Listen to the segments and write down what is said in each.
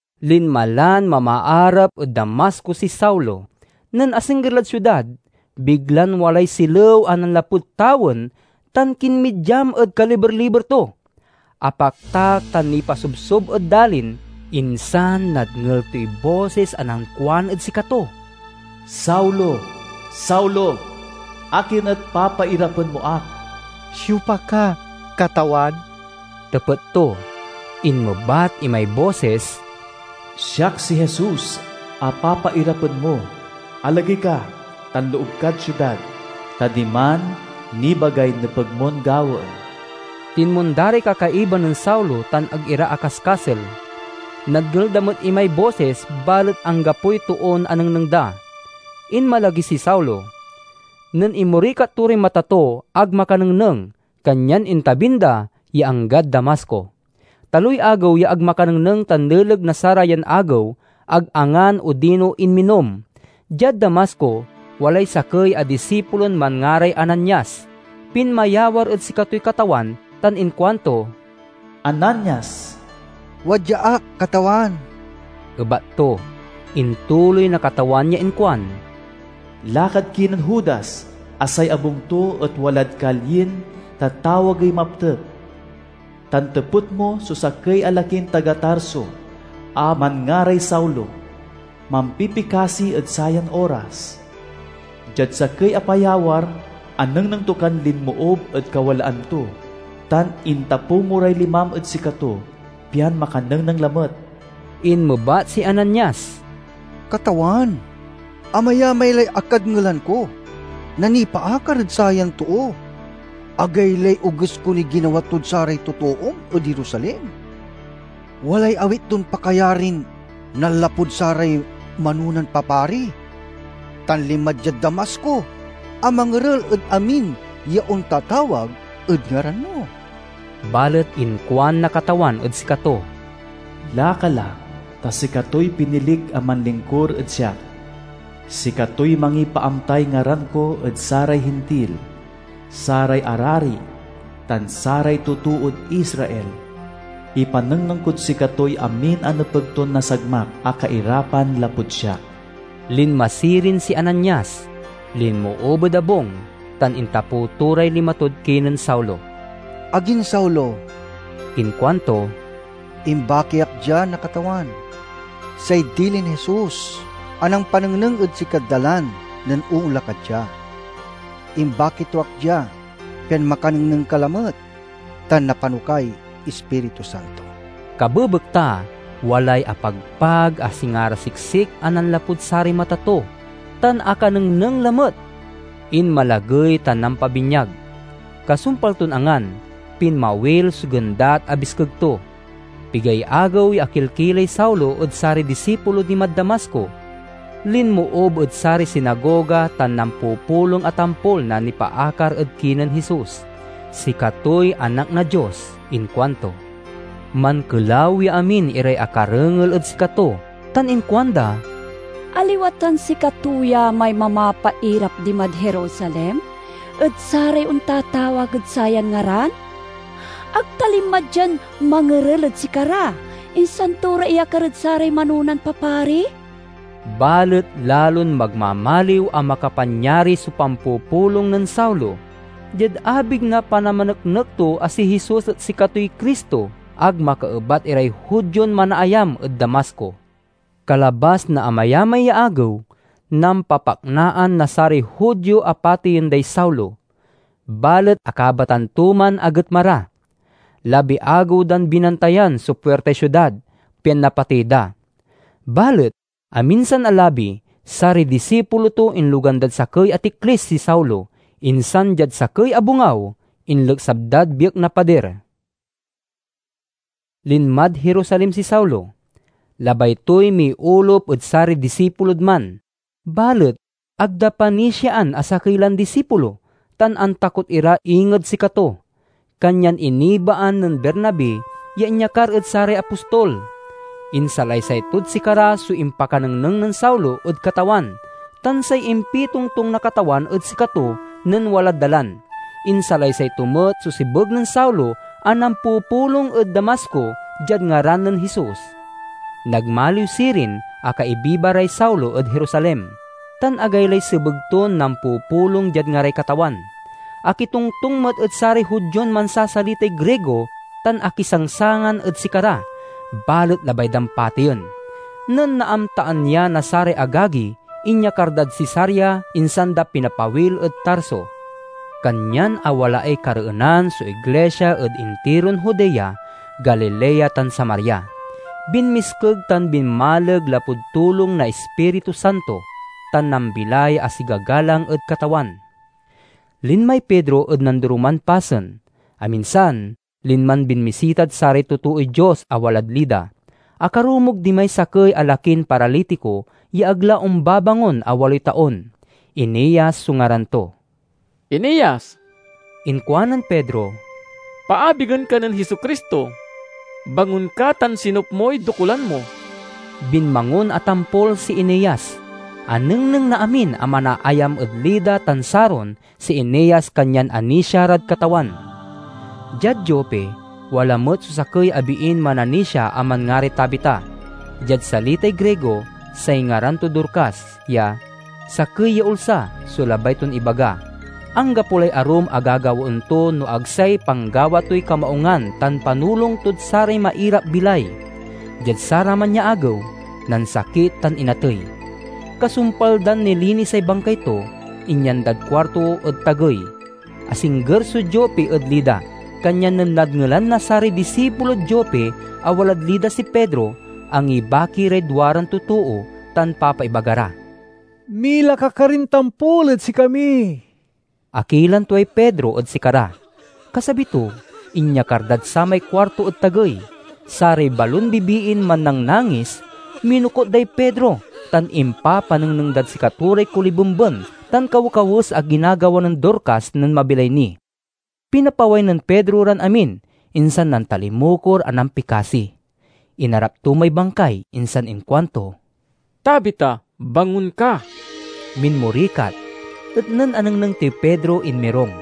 Linma lan mamaarap ed Damasco si Saulo. Nen asingger lad siudad, biglan walay silew a nanlapud tawen tan kinmidyam ed kaliber-liber to. Apaktak tan nipasobsob ed dalin, insan nadngel toy bosis a nankuan ed sikato, "Saulo, Saulo, akin et papairapen mo ak?" "Siopa ka, Katawan?" tepet to. Inmebat imay bosis, "Siak si Jesus a papairapen mo. Alagey ka tan loob kad siudad, ta diman nibagay nepeg mon gawaen." Tinmonda ray kakaiba nen Saulo tan ag ira akaskasel. Nadngel da met imay bosis, balet anggapoy toon anengneng da. Inmalagey si Saulo. Nen inmorikat to ray mata to ag makanengneng, kanyan intabin da ya anggad Damasco. Taloy agew ya ag makanengneng tan leleg na sarayan agew, ag angan odino inminom. Diad Damasco, walay sakey a disipulon manngaray Ananias. Pinmayawar ed sikatoy Katawan tan inkuanto, "Ananias!" "Wadya ak, Katawan," ebat to. Intuloy na Katawan ya inkuan, "Lakad kinen Judas a say abung to et walad kalyin tatawagey Maptek, tan tepet mo so sakey a lakin taga Tarso a manngaray Saulo. Mampipikasi ed sayan oras. Diad sakey a payawar, anengneng to kan linmoob ed kawalaan to, tan intapew mo ray limam ed sikato pian makanengneng lamet." Inmebat si Ananias, "Katawan, amayamay lay akadngelan ko na nipaakar ed sayan too. Agaylay oges konoy ginawa tod saray totoom ed Jerusalem. Walay awit ton pakayarin nanlapud saray manonan papari, tan linma diad Damasco a mangerel ed amin ya ontatawag ed ngaran mo." Balet inkuan na Katawan ed sikato, "Laka la, ta sikatoy pinilik a manlingkur ed siak. Sikatoy mangipaamtay ngaran ko ed saray Hintil, saray arari, tan saray totood Israel. Ipanengneng kod sikatoy amin a nepeg ton nasagmak a kairapan lapud siak." Linma sirin si Ananias, linmoob ed abung, tan intapew to ray lima tod kinen Saulo. "Agin Saulo," inkuanto, "imbaki ak dia na Katawan, say dilin Jesus a nampanengneng ed sikad dalan nen oonla ka dia. Imbaki to ak dia, pian makanengneng ka lamet tan napano kay Ispiritu Santo." Kabebekta walay apagpag a singa ra siksik a nanlapud saray mata to, tan akanengneng lamet. Inmalagey tan nampabinyag. Kasumpal ton angan, pinmawil so gendat a biskeg to. Pigay agew ya akilkilay Saulo ed saray disipulo dimad Damasco. Linmoob ed saray sinagoga tan nampupulong a tampol na nipaakar ed kinen Jesus. "Sikatoy Anak na Dios," inkuanto. Mankelaw ya amin iray akarengel ed sikato tan inkuanda, "Aliwa tan sikato ya may mamapairap dimad Jerusalem ed saray ontatawag ed sayan ngaran? Ag ta linma dian mangerel ed sikara, insan to ra iyakar ed saray manonan papari?" Balet lalon magmamaliw a makapanyari so pampupulong nen Saulo. Diad abig na panamaneknek to a si Jesus et sikatoy Cristo, ag makaebat iray Judion manaayam ed Damasco. Kalabas na amayamay ya agew, nampapaknaan na saray Judio a pateyen day Saulo, balet akabatan to man a getma ra. Labi-agew dan binantayan so puirtay siudad, pian napatey da. Balet aminsan a labi, saray disipulo to inlogan dad sakey a tiklis si Saulo, insan diad sakey a bongaw inleksab dad biek na padir. Linmad Jerusalem si Saulo. Labay toy miolup ed saray disipulod man, balet ag da panisiaan a sakey lan disipulo, tan antakot ira inged sikato. Kanyan inibaan nen Bernabe ya inyakar ed saray apostol. Insalaysay tod sikara so impakanengneng nen Saulo ed Katawan tan say impitongtong na Katawan ed sikato nen walad dalan. Insalaysay to met so sebeg nen Saulo a nampupulong ed Damasco diad ngaran nen Jesus. Nagmaliw sirin a kaibiba ray Saulo ed Jerusalem, tan agaylay sebeg ton nampupulong diad ngaray Katawan. Akitongtong met ed saray Judion mansasalitay Grigo tan akisangsangan ed sikara, balet labay dan pateyen. Nen naamtaan ya na saray agagi, inyakar dad Cesarea, insan da pinapawil ed Tarso. Kanyan awalaay kareenan so iglisia ed intiron Judea, Galilea tan Samaria; binmiskeg tan binmaleg lapud tulong na Ispiritu Santo, tan nambilay a sigagalang ed Katawan. Linmay Pedro ed nandoroman pasen. Aminsan, linman binmisitad saray totooy Dios a walad Lida. Akarumog dimay sakey a lakin paralitiko ya ag la ombabangon a waloy taon. Eneas so ngaran to. "Eneas," inkuanen Pedro, "paabigen ka nen Jesu-Cristo. Bangon ka tan sinup moy dokulan mo." Binmangon a tampol si Eneas. Anengneng na amin a manaayam ed Lida tan Saron si Eneas kanyan anisia rad Katawan. Diad Jope wala met so sakey a biin mananisia a manngaray Tabita. (Diad salitay Grigo say ngaran to Dorcas, ya "sakey ya ulsa" so labay ton ibaga.) Anggapo lay arum a gagawaen to no ag say panggawa toy kamaungan tan panulong tod saray mairap-bilay. Diad saraman ya agew nansakit tan inatey. Kasumpal dan nilinisay bangkay to, inyan dad kuarto ed tagey. Asingger so Jope ed Lida, kanyan nen nadngelan na saray disipulod Jope a walad Lida si Pedro, angibaki ray duaran totoo tan papaibaga ra, "Mila ka karin tampol ed sikami." Akilan tuay Pedro ed sikara. Kasabi to, inyakar dad samay kuarto ed tagey. Saray balon bibiin mannangnangis, minokut day Pedro, tan impapanengneng dad sikato ray kolibemben tan, kawekawes a ginagawa nen Dorcas nen mabilay ni. Pinapaway nen Pedro ran amin, insan nantalimukor a nampikasi. Inarap to may bangkay, insan inkuanto, "Tabita, bangon ka!" Minmorikat, et nen anengneng toy Pedro, inmirung.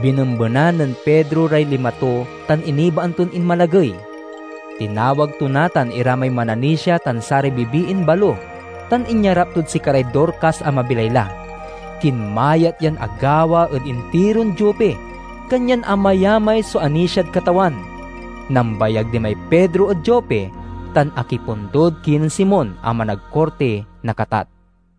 Binembenan nen Pedro ray lima to tan inibaan ton inmalagey. Tinawag to natan ira may mananisia tan saray bibiin balo, tan inyarap tod sikaray Dorcas a mabilay la. Kinmayat yan agawa ed intiron Jope, kanyan amayamay so anisiad Katawan. Nambayag dimay Pedro ed Jope, tan akipundod kinen Simon a managkurti na katat.